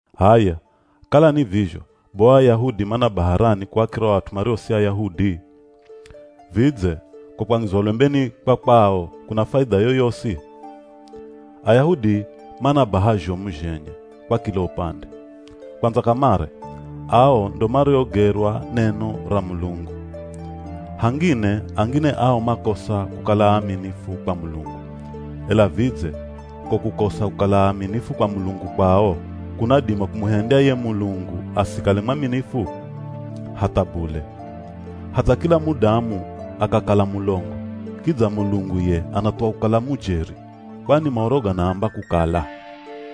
H'aya, kala ni vizho, be o Ayahudi mana baha rani kuakira at'u mario si Ayahudi? Vidze ko kwangizwa lwembeni kwa kwao kuna faidha yoyosi? Ayahudi mana baha zhomu zhenye kwa kila upande. Kwandza kamare, ao ndo mariogerwa neno ra Mulungu. Hangine angine ao makosa kukala aaminifu kwa Mulungu. Ela vidze ko kukosa kukala aaminifu kwa Mulungu kwao kunadima kumuhendya ye Mulungu asikale mwaminifu? Hatha bule. Hatha kila mudamu akakala mulongo, kidza Mulungu ye anathuwa kukala mujeri. Kwani Maoro ganaamba kukala,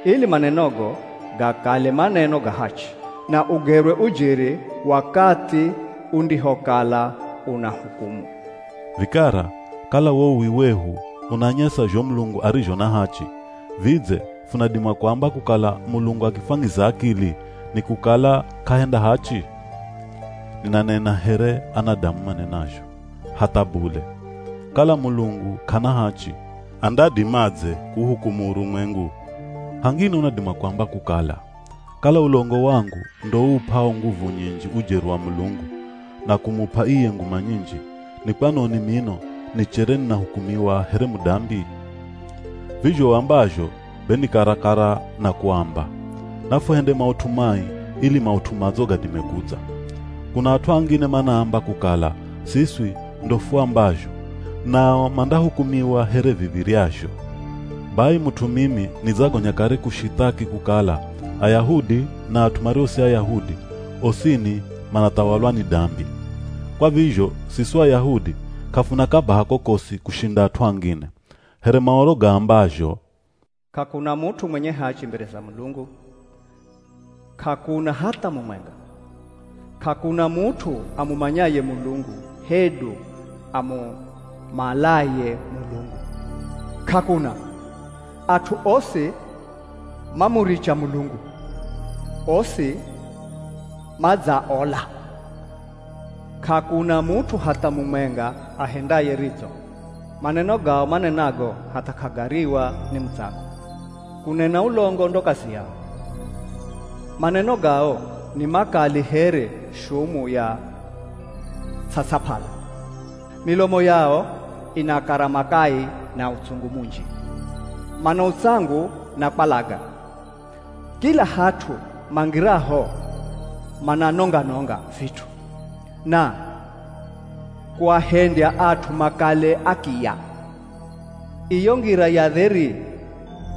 “ili manenogo gakale maneno ga hachi, na ugerwe ujeri wakathi undihokala unahukumu.” Vikara kala wo uwi wehu unanyesa zho Mulungu arizho na hachi, vidze funadima kuamba kukala Mulungu akifwangiza akili ni kukala k'ahenda hachi? (Ninanena here anadamu manenazho). Hatha bule, kala Mulungu k'ana hachi, andadimadze kuuhukumu urumwengu? Hangine unadima kuamba kukala, “Kala ulongo wangu ndo uup'ao nguvu nyinji ujeri wa Mulungu, na kumup'a iye nguma nyinji, ni kwanoni mino nichere ninahukumiwa here mudambi?” Vizho uambazho be ni karakara na kuamba, “Nafuhende maut'u mai ili maut'u madzo gadime kudza.” Kuna at'u angine manaamba kukala siswi ndo fuambazho, nao mandahukumiwa here viv̱iryazho. Bai mut'u mimi nidzagonya kare kushithaki kukala, Ayahudi, na at'u mario si Ayahudi, osini manathawalwa ni dambi. Kwa vizho siswi Ayahudi k'afuna kabaha kokosi kushinda at'u angine. Here Maoro gaambazho, “K'akuna mut'u mwenye hachi mbere za Mulungu, k'akuna hatha mumwenga! K'akuna mut'u amumanyaye Mulungu, hedu amumalaye Mulungu, K'akuna! At'u osi mamuricha Mulungu, Osi madzaola. K'akuna mut'u hatha mumwenga ahendaye ridzo.” “Maneno gao manenago hatha k'agariwa ni mutsango. Kunena ulongo ndo kazi yao. Maneno gao ni makali here shumu ya ts'ats'ap'ala.” “Milomo yao ina karama kai na utsungu munji.” “Mana utsangu na kwalaga. Kila hat'u mangiraho mananonga-nonga vit'u, na kuahendya at'u makale akiya. Iyo ngira ya dheri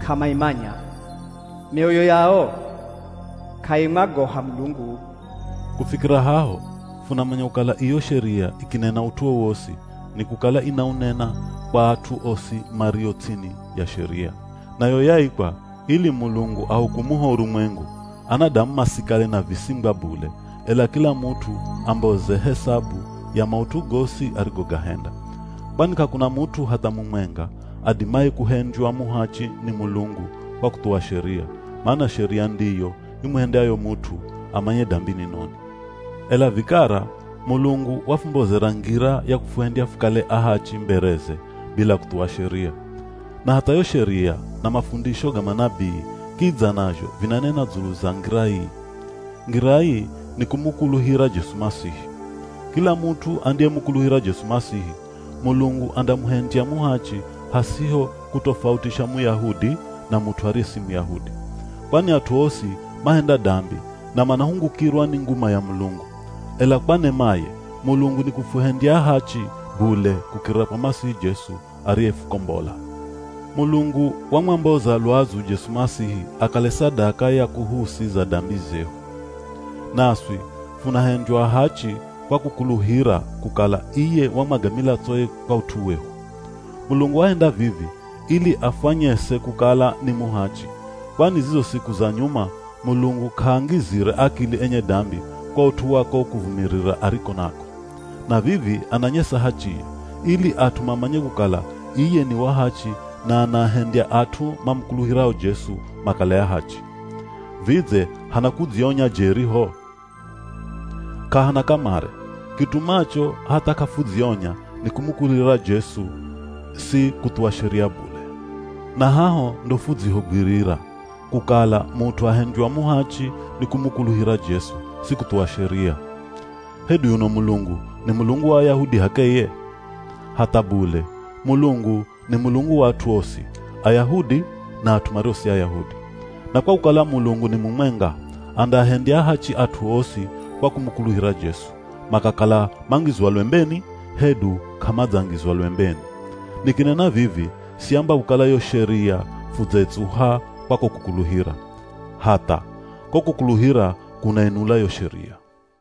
k'amaimanya.” “Myoyo yao k'aimwagoha Mulungu.” Kufikira haho, funamanya kukala iyo Sheria ikinena ut'u wowosi ni kukala inaunena kwa at'u osi mario ts'ini ya Sheria. Nayo yaikwa ili Mulungu ahukumuho urumwengu, anadamu masikale na visingwa bule, ela kila mut'u amboze hesabu ya maut'u gosi arigogahenda. Kwani k'akuna mut'u hatha mumwenga adimaye kuhendywa muhachi ni Mulungu kwa kuthuwa Sheria, mana Sheria ndiyo imuhendyayo mut'u amanye dambi ni noni. Ela vikara Mulungu wafumbozera ngira ya kufuhendya fukale ahachi mbereze bila kuthuwa Sheria. Na hatha yo Sheria na mafundisho ga manabii kidza nazho vinanena dzulu za ngira ii. Ngira ii ni kumukuluhira Jesu Masihi. Kila mut'u andiyemukuluhira Jesu Masihi, Mulungu andamuhendya muhachi hasiho kutofautisha Muyahudi na mut'u ariye si Muyahudi. Kwani at'u osi mahenda dambi na manahungukirwa ni nguma ya Mulungu. Ela kwa nemaye, Mulungu nikufuhendya ahachi bule kukirira kwa Masihi Jesu ariyefukombola. Mulungu wamwamboza lwazu Jesu Masihi akale sadaka ya kuhuusiza dambi zehu. Naswi funahendywa ahachi kwa kukuluhira kukala iye wamwaga milatsoye kwa ut'u wehu. Mulungu wahenda vivi ili afwanyese kukala ni muhachi, kwani zizo siku za nyuma Mulungu k'aangizire akili enye dambi kwa ut'u wa ko kuvumirira ariko nako. Na vivi ananyesa hachiye, ili at'u mamanye kukala iye ni wa hachi na anaahendya at'u mamukuluhirao Jesu, makale ahachi. Vidze hana kudzionya jeri ho? K'ahana kamare. Kitumacho hatha k'afudzionya ni kumukuluhira Jesu, si kuthuwa Sheria bule. Na haho ndo fudzihogwirira, kukala mut'u ahendywa muhachi ni kumukuluhira Jesu, si kuthuwa Sheria. Hedu yuno Mulungu ni Mulungu wa Ayahudi h'akeye? Hatha bule, Mulungu ni Mulungu wa at'u osi, Ayahudi na at'u mario si Ayahudi. Na kwa kukala Mulungu ni mumwenga, andaahendya ahachi at'u osi kwa kumukuluhira Jesu, makakala mangizwa lwembeni hedu k'amadzangizwa lwembeni. Nikinena vivi siamba kukala yo Sheria fudzaitsuha kwa ko kukuluhira. Hatha, ko kukuluhira kunainula yo Sheria.